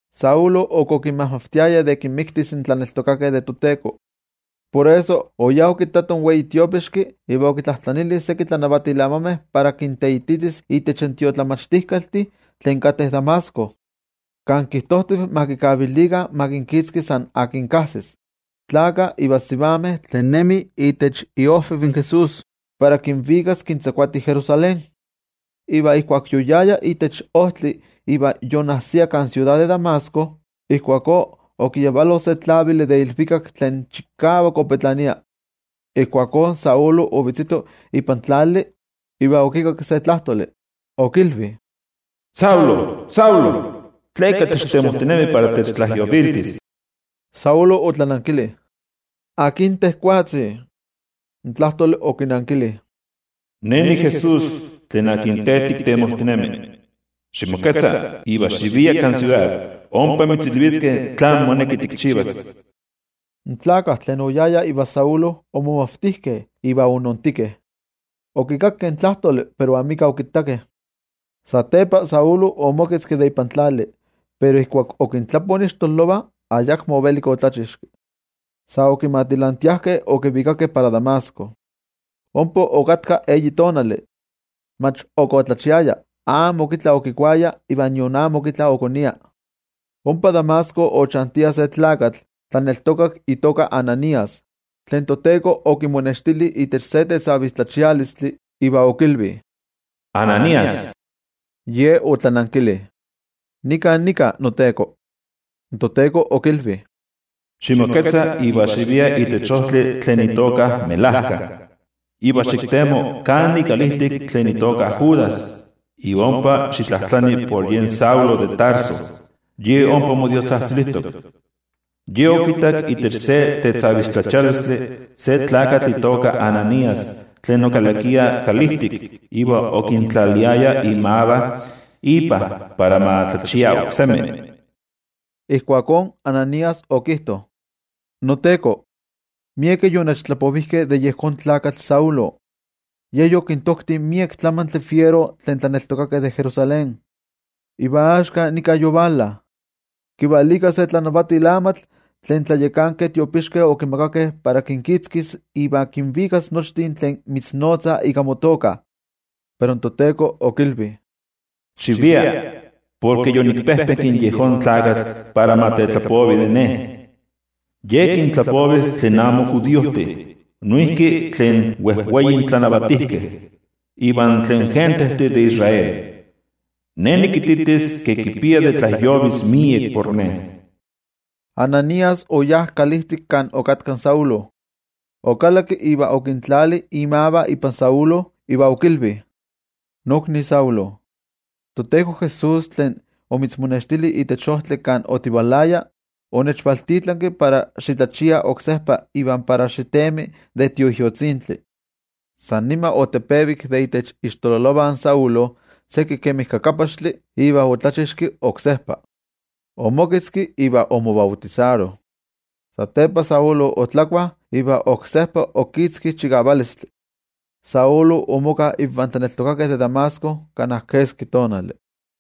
Saulo, ok okinmajmavtiaya de kinmiktis in tlaneltokakeh de toTeko. Por eso, oyá okittato in wei tiopixki, iva okitlajtlanili seki tlanavatil amameh para kinteititis itech tiotlamachtijkaltih tlen kateh Damasco, kan kijtojtiv ma kikavilikah ma kinkitzki san akin kajsis, tlakah iva sivameh tlen nemih itech iOjviv in Jesús, para kinvikas kintzakuati Jerusalén. Iva ijkuak yoyaya itech ojtli iva yonnajsia kan siudad de Damasco, ijkuakó okiyavalo se tlavili de ilvikak tlen chikavak opetlania. Ijkuakó Saulo ovetzito ipan tlali, iva okikakki se tlajtoli, okilvi: —Saulo, Saulo, ¿tleka techtemojtinemi para techtlajyoviltis? Saulo otlanankili: —¿Akin tejwatzi? In tlajtoli okinankili: —Ne niJesús, tlen te tiktemojtinemi. Ximoketza iva xivia kan siudad, ompa mitzilviskeh tlán moneki tikchivas. In tlakah tlen oyayah ivan Saulo, omomavtijkeh iva onoontikeh, okikakkeh in tlajtoli pero amika okittakeh. Satepa Saulo omoketzki de ipan tlali, pero ijkuak okintlapo ixtololovah, ayakmo ovelik otlachixki. Sa okimatilantiajkeh okivikakeh para Damasco. Ompa okatka eyi tonali, mach ok otlachiaya, amo ok itla okikuaya iva nion amo ok itla okonia. Ompa Damasco ochantia se tlakatl tlaneltokak itoka Ananías, tlen toTeko okimonextili itech se tetzavistlachialistli. Iva okilvi: —¡Ananías! Ye otlanankili: —Nikan nika, noTeko. In toTeko okilvi: —Ximoketza iva xivia itech ojtli tlen itoka Melajka, iva xiktemo kán ikalijtik tlen itoka Judas, iva ompa xitlajtlani por yen Saulo de Tarso. Ye ompa modiostzajtzilijtok. Ye okittak itech se tetzavistlachialistli se tlakatl itoka Ananías tlen okalakia kalijtik iva okintlaliaya imavah ipa para ma tlachia oksemi. Ijkuakó Ananías okijto: —NoTeko, miekeh yonechtlapovijkeh de yejón tlakatl Saulo, ke yokintokti miek tlamantli fiero tlen tlaneltokakeh de Jerusalén. Iva axka nika yovala, kivalika se tlanavatil amatl tlen tlayakankeh tiopixkeh okimakakeh para kinkitzkis iva kinvikas nochtin tlen mitznotzah ika motoka. Pero in toTeko okilvi: —Xivia, porke yonikpejpenki yejón tlakatl para ma tetlapovi de Ne. Ye kintlapovis tlen amo judiojtih, noijki tlen wejwei tlanavatijkeh iva tlen gentejtih de Israel. Ne nikititis ke kipia de tlajyovis miek por Ne. Ananías oyá kalijtik kan okatka in Saulo. Okalakki iva okintlali imavah ipan Saulo, iva okilvi: —Nokni Saulo, toTeko Jesús, tlen omitzmonextili itech ojtli kan otivalaya, onechvaltitlanki para xitlachia oksejpa iva para xitemi de Tioijyotzintli. San nima otepevik de itech ixtololovah in Saulo seki kemi kakapaxtli, iva otlachixki oksejpa. Omoketzki iva omobautisaro. Satepa otlakua iva oksejpa okitzki chikavalistli. Saulo omoka invan tlaneltokakeh de Damasco kana keski tonali.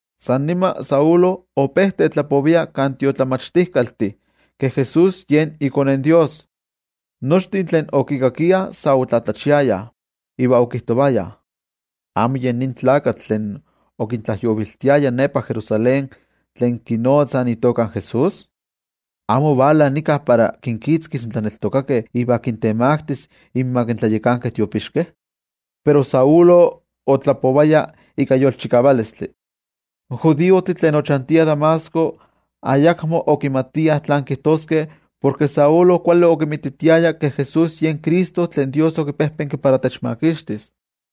San nima Saulo ope tetlapovia kan tiotlamachtijkaltih ke Jesús yen iKone in Dios. Nochtin tlen okikakiah sa otlatlachiayah, iva okijtovayah: —¿Amo yen nin tlakatl tlen okintlajyoviltiaya nepa Jerusalén tlen kinotzah itoka in Jesús? ¿Amo ovala nika para kinkitzkis in tlaneltokakeh iva kintemaktis inmak in tlayakankeh tiopixkeh? Pero Saulo otlapovaya ika yolchikavalistli. In judiojtih tlen ochantiah Damasco ayakmo okimatiah tlán kijtoskeh porke Saulo kuali okinmititiaya ke Jesús yen Cristo tlen Dios okipejpenki para techmakixtis.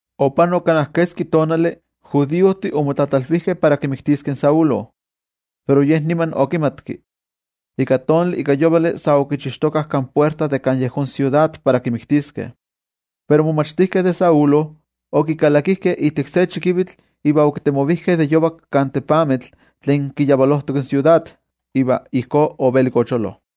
Opanok kana keski tonali, in judiojtih omotlatlalvijkeh para kimiktiskeh in Saulo, pero ye niman okimatki. Ika tonali ika yovali sa okichixtokah kan puerta de kan yejón siudad para kimiktiskeh. Pero in momachtijkeh de Saulo, okikalakijkeh ijtik se chikivitl iva okitemovijkeh de yovak kan tepamitl tlen kiyavalojtok in siudad. Iva ijkó ovelik ocholo.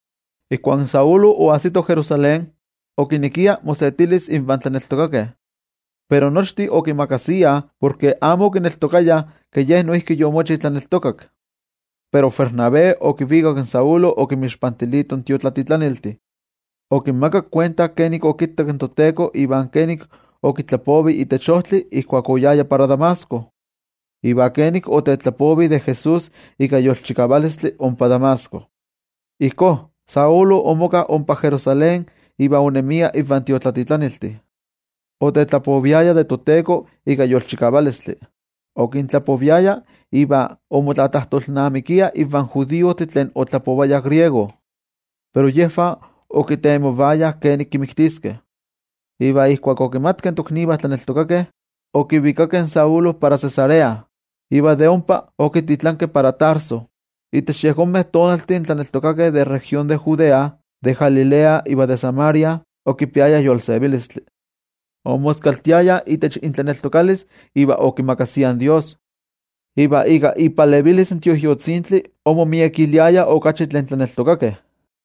Ijkuak in Saulo oajsito Jerusalén, okinekia mosetilis invan tlaneltokakeh. Pero nochtin okimakasiah, porke amo okineltokayah ke ye noijki yomochi tlaneltokak. Pero Bernabé okivikak in Saulo okinmixpantilito in tiotlatitlaniltih. Okinmakak kuenta kenik okittak in toTeko iva kenik okitlapovi itech ojtli ijkuak oyaya para Damasco, iva kenik otetlapovi de Jesús ika yolchikavalistli ompa Damasco. Ijkó, Saulo omoka ompa Jerusalén iva onemia invan tiotlatitlaniltih. Otetlapoviaya de toTeko ika yolchikavalistli. Okintlapoviaya iva omotlatlajtolnamikia invan judiojtih tlen otlapovayah griego. Pero yejvah okitemovayah kenik kimiktiskeh. Iva ijkuak okimatkeh in toknivah tlaneltokakeh, okivikakeh in Saulo para Cesarea, iva de ompa okititlankeh para Tarso. Itech yejonmeh tonaltih in tlaneltokakeh de región de Judea, de Galilea iva de Samaria, okipiayah yolsevilistli. Omoskaltiayah itech intlaneltokalis iva okimakasiah in Dios. Iva ika ipalevilis in Tioijyotzintli omomiekiliayah okachi tlen tlaneltokakeh.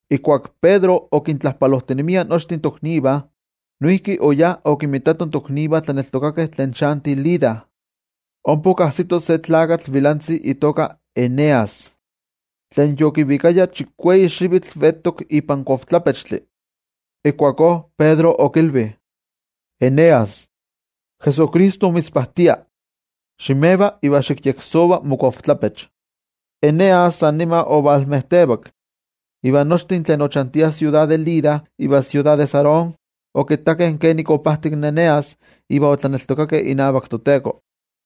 Ijkuak Pedro okintlajpalojtinemia nochtin toknivah, noijki oyá okinmitato in toknivah tlaneltokakeh tlen chantih Lida. Ompa okajsito se tlakatl vilantzi itoka Eneas, tlen yokivikaya chikueyi xivitl vetok ipan kochtlapechtli. Ijkuakó Pedro okilvi: —Eneas, Jesucristo mitzpajtia. Ximeva iva xikyeksova mokochtlapech. Eneas san nima ovalmejtevak. Iva nochtin tlen ochantiah siudad de Lida iva siudad de Sarón okittakeh kenik opajtik in Eneas iva otlaneltokakeh inavak toTeko.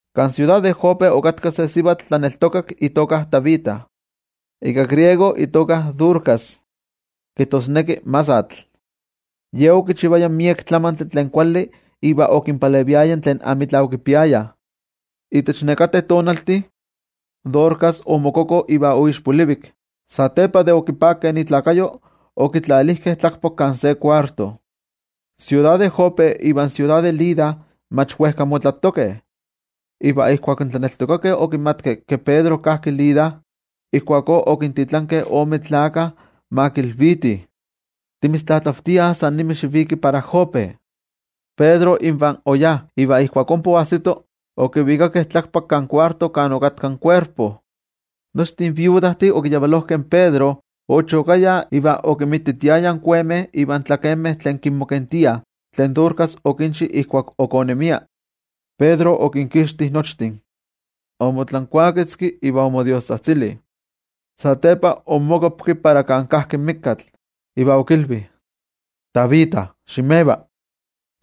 Kan siudad de Jope okatka se sivatl tlaneltokak itoka Tabita, ika griego itoka Dorcas kijtosneki masatl. Ye okichivaya miek tlamantli tlen kuali iva okinpaleviaya tlen amitla okipiayah. Itech nekateh tonaltih, Dorcas omokoko iva oixpolivik. Satepa de okipakeh ikuerpo, okitlalijkeh tlakpak kan se kuarto. In siudad de Jope ivan siudad de Lida mach wejka motlatokeh. Iva ijkuak in tlaneltokakeh okimatkeh ke Pedro kajki Lida, ijkuakó okintitlankeh ome tlakah ma kilvitih: —Timitztlatlavtiah san nima xiviki para Jope. Pedro invah oyajki iva ijkuak ompa oajsito, okivikakeh tlakpak kan kuarto kan okatka in kuerpo. Nochtin iknosivameh okiyavalojkeh in Pedro ochokayah iva okinmititiayah in kuemeh ivan tlakemeh tlen kimokentiah tlen Dorcas okinchi ijkuak ok onemia. Pedro okinkixti nochtin. Omotlankuaketzki iva omodiostzajtzili. Satepa onmokuapki para kan kajki in mikatl, iva okilvi: —¡Tabita, ximeva!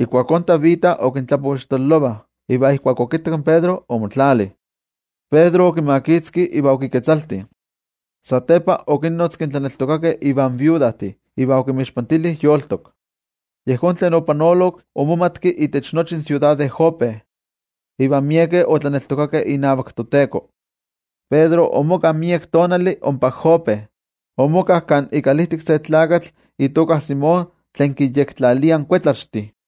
Ijkuakó Tabita okintlapo ixtololovah, iva ijkuak okittak in Pedro, omotlali. Pedro okimakitzki iva okiketzalti. Satepa okinnotzki in tlaneltokakeh ivan iknosivameh, iva okinmixpantili yolitok. Yejón tlen opanolok omomatki itech nochi in siudad de Jope, iva miekeh otlaneltokakeh inavak toTeko. Pedro omoka miek tonali ompa Jope. Omoka kan ikalijtik se tlakatl itoka Simón tlen kinyektlalia kuetlaxtih.